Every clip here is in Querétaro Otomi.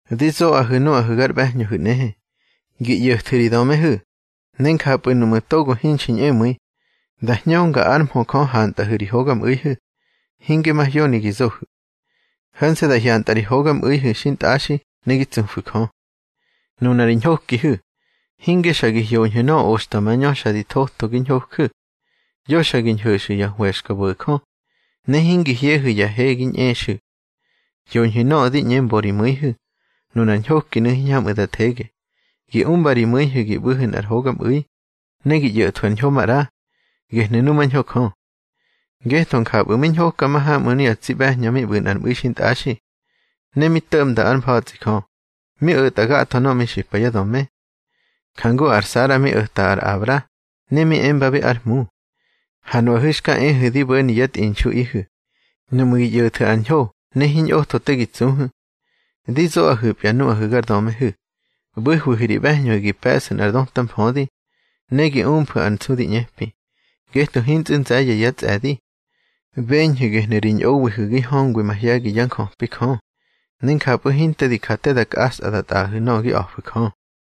Di zoꞌahu̱ nuꞌahu̱ gar ꞌbe̱hñöhu̱ nꞌehe, gi ꞌyo̱thu̱ ri dömehu̱, ne njapꞌu̱ nuꞌmu̱ togo hinxi ñꞌemu̱i, da hñönga ár mhö Jö hantꞌahu̱ ri hogamꞌu̱ihu̱, hinge mahyoni gi zohu̱. Ho̱nse̱ da hyantꞌa ri hogamꞌu̱ihu̱ xintꞌaxi ne gi tsufu̱ Jö. Nuna ri ñhokihu̱, hinge xa gi hyoñhu̱ nöꞌö oxta mañö xa di thotho gi ñhoju̱. Yo xa gi ñho̱xu̱ ya hwe̱xkabo̱jö, ne hingi hyehu̱ ya he gi ñꞌexu̱. Hyoñhu̱ nöꞌö di ꞌñe mbo ri mu̱ihu̱. Nunar ñhokinu̱ hiñhamꞌu̱ da thege. Gi umba ri mu̱ihu̱ gi ꞌbu̱hu̱ nꞌar hogamꞌu̱i, ne gi ꞌyo̱thwu̱ ar ñho maꞌra. Gehnu̱ numañho Jö. Ngetho njapꞌu̱ mi ñhoka mahamꞌu̱ nuꞌu̱ ya tsi ꞌbe̱hñö mi ꞌbu̱ nꞌar mꞌu̱i xintꞌaxi. Ne mi to̱ꞌmba ár mfa̱tsꞌi Jö, mi o̱ta gatho nöꞌö mi xipa yá döme. Jangu ar Sara mi o̱ta ar Abra, ne mi embabi ár hmu. Ha nuꞌahu̱ xka ehu̱ di bo̱ni yá tꞌinxuꞌihu̱, nuꞌmu̱ gi ꞌyo̱thu̱ ar ñho ne hiñꞌotho te gi tsuhu̱. Di zoꞌahu̱pya nuꞌahu̱ gar dömehu̱, ꞌbu̱hwihu̱ ri ꞌbe̱hñöhu̱ gi pe̱ꞌsu̱ nꞌar döta mfödi, ne gi umfu̱ ar nsu di ꞌñepi, ngetho hintsꞌu̱ nze̱ye̱ yá tsꞌe̱di. Beñhu̱ gehnu̱ ri ñꞌowihu̱ gi hñöngwi mahye̱gi yá njöpi Jö, ne njapꞌu̱ hinte di ja te da kꞌaꞌsa da tꞌaꞌahu̱ nöꞌö gi a̱fu̱ Jö.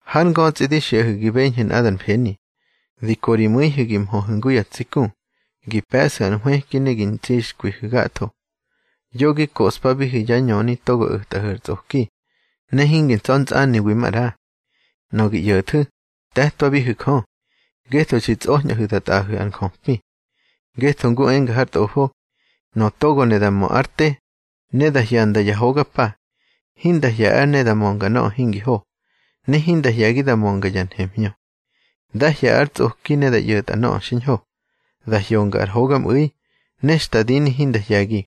Hár ngötsꞌi di xiꞌahu̱ gi beñhu̱ nꞌadar mfeni, di ko ri mu̱ihu̱ gi mhöhu̱ ngu ya tsi ku, gi pe̱ꞌsu̱ ar nhwëki ne gi ntsixkwihu̱ gatho. Yo gi koꞌspabihu̱ yá ñöni togo o̱tꞌahu̱ ar tsꞌoki, ne hingi ntsa̱ntsꞌaniwi maꞌra. Nöꞌö gi ꞌyo̱thu̱, te̱twathohu̱ Jö, ngetho xi tsꞌoñꞌahu̱ da tꞌaꞌahu̱ ar njöpi. Ngetho ngu enga har Tꞌofo: Nöꞌö togo ne da mö ár te, ne da hyanda ya hoga pa, hinda hye̱ ár ne da mönga nöꞌö hingi ho, ne hinda hye̱gi da mönga ya nhemhñö. Dá hye̱ ar tsꞌoki ne da ꞌyo̱tꞌa nöꞌö xiñho. Da hyonga ar hogamꞌu̱i, ne xta dini hinda hye̱gi.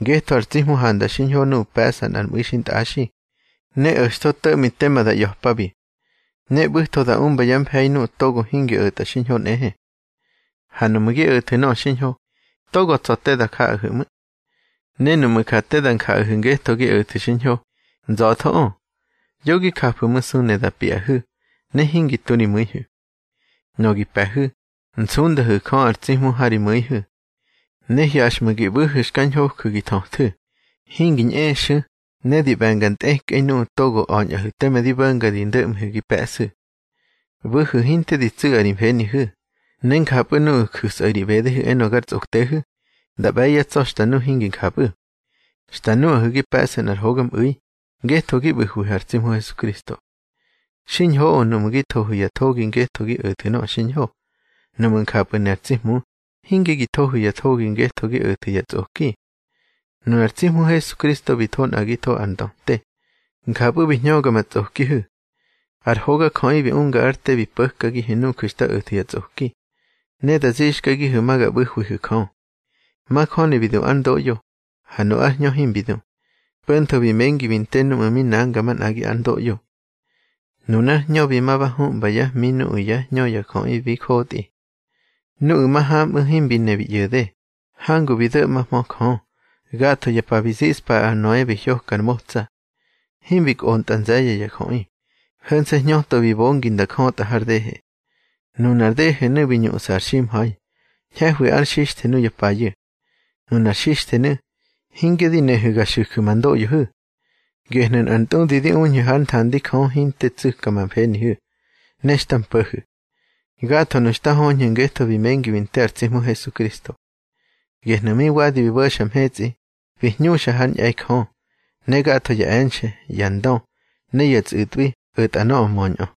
Ngetho ar tsi Hmu handa xiñho nuꞌu̱ pe̱ꞌsa nꞌar mꞌu̱i xintꞌaxi, ne o̱xtho to̱ꞌmi tema da ꞌya̱pabi. Ne ꞌbu̱tho da umba yá mfe̱i nuꞌu̱ togo hingi o̱tꞌa xiñho nꞌehe. Ha nuꞌmu̱ gi o̱thu̱ nöꞌö xiñho, togo tsa̱ te da jaꞌahu̱ ꞌmu̱. Ne nuꞌmu̱ ja te da njaꞌahu̱ ngetho gi o̱thu̱ xiñho, nza̱thoꞌö. Yo gi jafu̱masu ne da piꞌahu̱, ne hingi tu ri mu̱ihu̱. Nöꞌö gi pe̱hu̱, nsundahu̱ Jö ar tsi Hmu ha ri mu̱ihu̱. Ne hyaxꞌmu̱ gi ꞌbu̱hu̱ xka ñhoju̱ gi thöthu̱, hingi ñꞌexu̱ ne di ꞌbe̱nga ntꞌekꞌei nuꞌu̱ togo a̱ñꞌahu̱ teme di bo̱nga ri ndo̱ꞌmihu̱ gi pe̱ꞌsu̱. ꞌBu̱hu̱ hinte di tsu̱ꞌa ri mfenihu̱. Ne njapꞌu̱ nuꞌu̱ ju̱sꞌahu̱ ri ꞌbedehu̱ enö gar tsꞌoktehu̱, da ꞌbe̱ yá tsa̱ xta nu hingi njapꞌu̱. Xta nuꞌahu̱ gi pe̱ꞌsu̱ nꞌar hogamꞌu̱i, ngetho gi ꞌbu̱hwihu̱ ar tsi Hmu Hesukristo. Xiñhoꞌö nuꞌmu̱ gi thohu̱ ya thogi ngetho gi o̱thu̱ nöꞌö xiñho, nuꞌmu̱ njapꞌu̱ ne ar tsi Hmu, hinge gi thohu̱ ya thogi ngetho gi o̱thu̱ ya tsꞌoki. Nunar tsi Hmu Hesukristo bi tho nꞌagitho ar ndöte, njapꞌu̱ bi hñöga ma tsꞌokihu̱. Ar hogajöꞌi bi unga ár te bi po̱kagihu̱ nuju̱ xta o̱thu̱ ya tsꞌoki, ne da zixkagihu̱ ma ga ꞌbu̱hwihu̱ Jö. Majöni bi du ár ndoꞌyo, ha nu ár hñö himbi du, po̱ntho bi mengi bi nte núꞌmu̱ mi nanga manꞌagi ár ndoꞌyo. Nunár hñö bi ma ba humbyá hmi nuꞌu̱ yá hñö ya jöꞌi bi jotꞌi. Nuꞌu̱ mahamꞌu̱ himbi ne bi ꞌyo̱de, hangu bi do̱ꞌmahmö Jö, gatho ya pa bi ziꞌspa ar Noe bi hyoka ar motsa. Himbi kꞌontꞌa nze̱ye̱ ya jöꞌi, ho̱nse̱ hñöto bi bongi nda jötꞌa har dehe. Nunar dehenu̱ bi ñuꞌsa ar ximha̱i, ñhe̱hwi ar xixthe nuya payu̱. Nunar xixthenu̱, hinge di nehu̱ ga xu̱ju̱ ma ndoꞌyohu̱. Gehnu̱ nꞌar ntꞌudi di uñhu̱ hár nthandi Jö hinte tsu̱ka ma mfenihu̱, ne xta mpo̱hu̱. Gathonu̱ xta höñhu̱ ngetho bi mengi bi nte ar tsi Hmu Hesukristo. Gehnu̱ mi wadi bi bo̱xa mhetsꞌi, bi hñuxa hár ñꞌe̱i Jö. Ne gatho ya e̱nxe̱, ya ndö ne ya tsꞌu̱tꞌwi o̱ta nöꞌö möñꞌö.